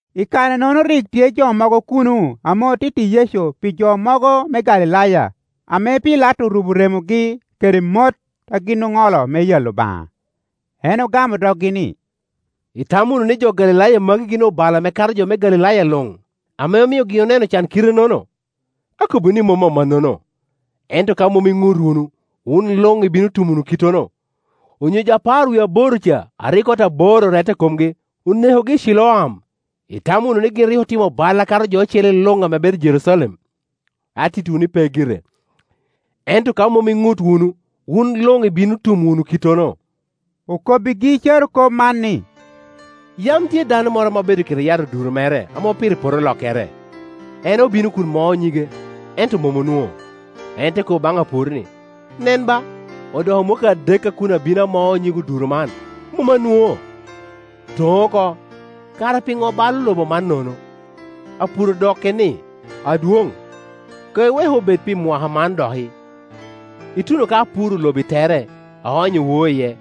I kare-nono rik tye jo mogo kuno ame otitti Yecu pi jo mogo me Galilaya ame Pilato orubo remogi kede mot a gin oŋolo me yalo Obaŋa. En ogamo doggi ni, “Itamo wunu ni jo Galilaya magi gin obalo ame kato jo me Galilaya luŋ, ame omio gin oneno can kite-nono? Akobbiwu ni, mom amannono; ento ka mom iŋut wunu, wun luŋ ibino tum wunu kittono. Onyo jo apar wie aboro ca a rik ot abor orette i komgi, onekogi i Ciloam, itamo wunu ni gin rik otimo bal akato jo ocele luŋ ame bedo i Jerucalem? Attiitwu ni, pe gire; ento ka mom iŋut wunu, wun luŋ ibino tum wunu kittono.” Okobbigi carokop man ni, “Yam tye dano moro ame obedo kede yat oduro mere ame opito i poto olokkere. En obino kun moo nyige, ento mom onwoŋo. En te kobo baŋ apur ni, ‘Nen ba, odoko mwakki adek a kun abino amao nyig oduro man, mom anwoŋo. Toŋ oko; kara piŋo balo lobo man nono?’ Apur odokke ni, ‘Adwoŋ, koŋ iwek obed pi mwaka man doki, ituno ka apuro lobo i tere, aonyo woo iye.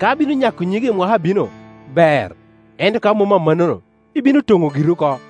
Ka bino nyako nyige i mwaka abino, ber, ento ka mom amannono, ibino toŋo giri oko.’”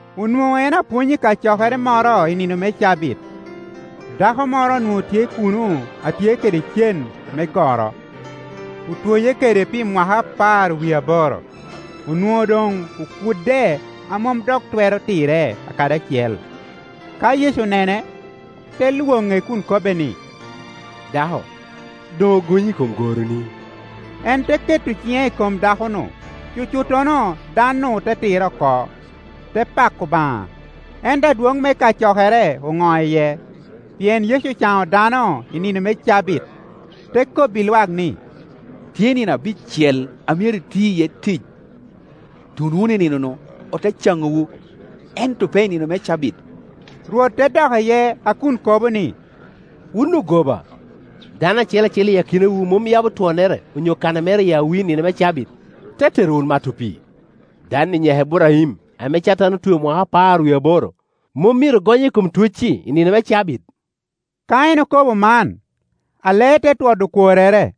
Onwoŋo en apwony i kacokere moro i nino me cabit. Dako moro onwoŋo tye kuno a tye kede cen me goro, otwoye kede pi mwaka apar wie aboro; onwoŋo doŋ okudde a mom dok twero tirre kadi acel. Ka Yecu onene, te lwoŋe kun kobbe ni, “Dako, doŋ ogonyi i kom goroni.” En te keto ciŋe i kom dako-nu, cucuttono dan-nu te tirre oko, te pako Obaŋa. Ento adwoŋ me kacokere oŋo iye, pien Yecu ocaŋo dano i nino me cabit, te kobbi lwak ni, “Tye nino abicel a myero ti iye tic; tun wunu i nino-nu, ote caŋowu, ento pe i nino me cabit.” Rwot te dok iye a kun kobo ni, “Wun ogoba! Dano acel acel i akinawu mom yabo twonnere onyo kana mere i awi i nino me cabit, te tero wot mato pii? Dan-ni nyaka Iburaim, ame Catan otweo mwaka apar wie aboro, mom myero gonye i kom twee-ci i nino me cabit?” Ka en okobo man, alee te twodo okworrere;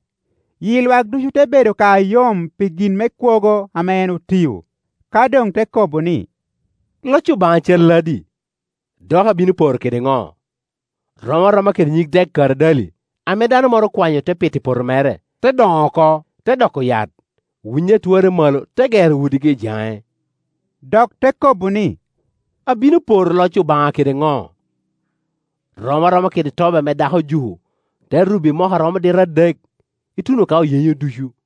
yi lwak ducu te bedo ka ayom pi gin me kwogo ame en otio. Ka doŋ te kobo ni, “Loc Obaŋa calladi? Dok abino poro kede ŋo? Rom aroma kede nyig dek karadali ame dano moro okwanyo, te pito i poto mere; te doŋo oko, te doko yat, winyi a twarre malo te gero udigi i jaŋe.” Dok te kobo ni, “Abino poro loc Obaŋa kede ŋo? Rom aroma kede tobi ame dako ojuko, te rubo i moko a romo dita adek, ituno ka oyenyo ducu.”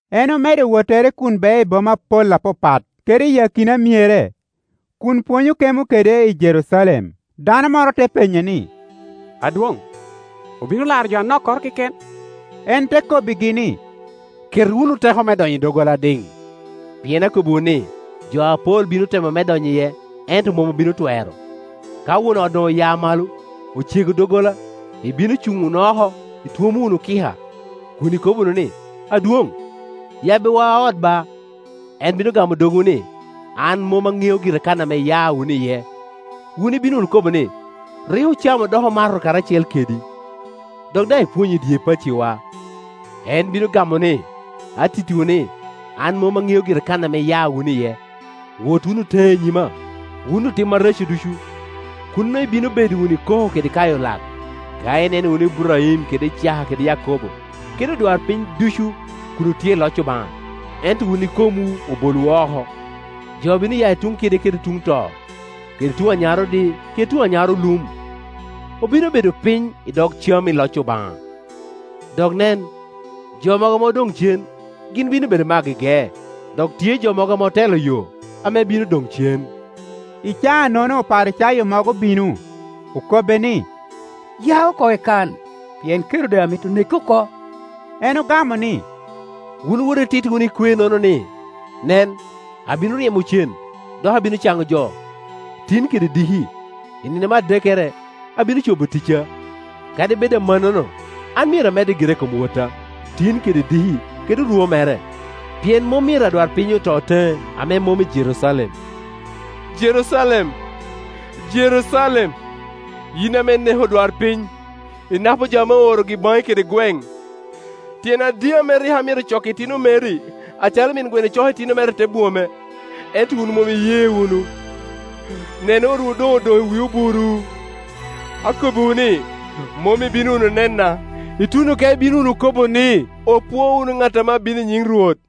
En omedo wottere kun beo i boma apol apapat kede i akina myere, kun pwonyo kemo kede i Jerucalem. Dano moro te penye ni, “Adwoŋ, obino laro jo anokkoro keken?” En te kobbigi ni, “Ket wunu teko me donyo i doggola adiŋ; pien akobbiwu ni, jo apol bino temo me donyo iye, ento mom obino twero. Ka won ot doŋ oya malo, ocego doggola, ibino cuŋ wunu i oko itwomo wunu kika, kun ikobo wunu ni, ‘Adwoŋ, yabbiwa ot ba!’ En bino gamo dogwu ni, ‘An mom aŋeo gira kan ame iya wunu iye.’ Wun ibino wunu kobo ni, ‘Rik ocamo dok omato karacel kedi, dok daŋ ipwonyo i dye pacciwa.’ En bino gamo ni, ‘Atittiwu ni, an mom aŋeo gira kan ame iya wunu iye. Wot wunu teŋe i nyima, wun otim areco ducu!’ Kuno ibino bedo wunu i koko kede kayo lak, ka ineno wunu Iburaim kede Icaka kede Yakobo, kede odwarpiny ducu kun otye i loc Obaŋa, ento wun ikomwu obolowu oko. Jo bino ya i tuŋ kide kede tuŋ to, kede tuŋ anyarodi kede tuŋ anyarolum, obino bedo piny i dog cam i loc Obaŋa. Dok nen, jo mogo ame odoŋ cen, gin bino bedo me agege, dok tye jo mogo ame otelo yo, ame bino doŋ cen.” I caa-nono Oparicayo mogo obino, okobbe ni, “Ya oko i kan, pien Kerode amito neki oko.” En ogamo ni, “Wun wot ititti wunu ekwe-nono ni, ‘Nen, abino ryemo cen, dok abino caŋo jo, tin kede diki, i nino me adekkere abino cobo ticca. Kadi bed amannono an myero amedde gira i kom wotta tin kede diki kede orwo mere, pien mom myero adwarpiny oto teŋe ame mom i Jerucalem.’ Jerucalem, Jerucalem, yin ame ineko odwarpiny, inapo jo ame oorogi baŋi kede gweŋ, tyen adi ame rik amito coko itino meri acalo min gweno coko itino mere i te bwome, ento wun mom iye wunu! Nen, otwu doŋ odoŋ i wi obur iwu. Akobbiwu ni, mom ibino wunu nena, ituno ka ibino wunu kobo ni, ‘Opwo wunu ŋat ame abino i nyiŋ Rwot.’”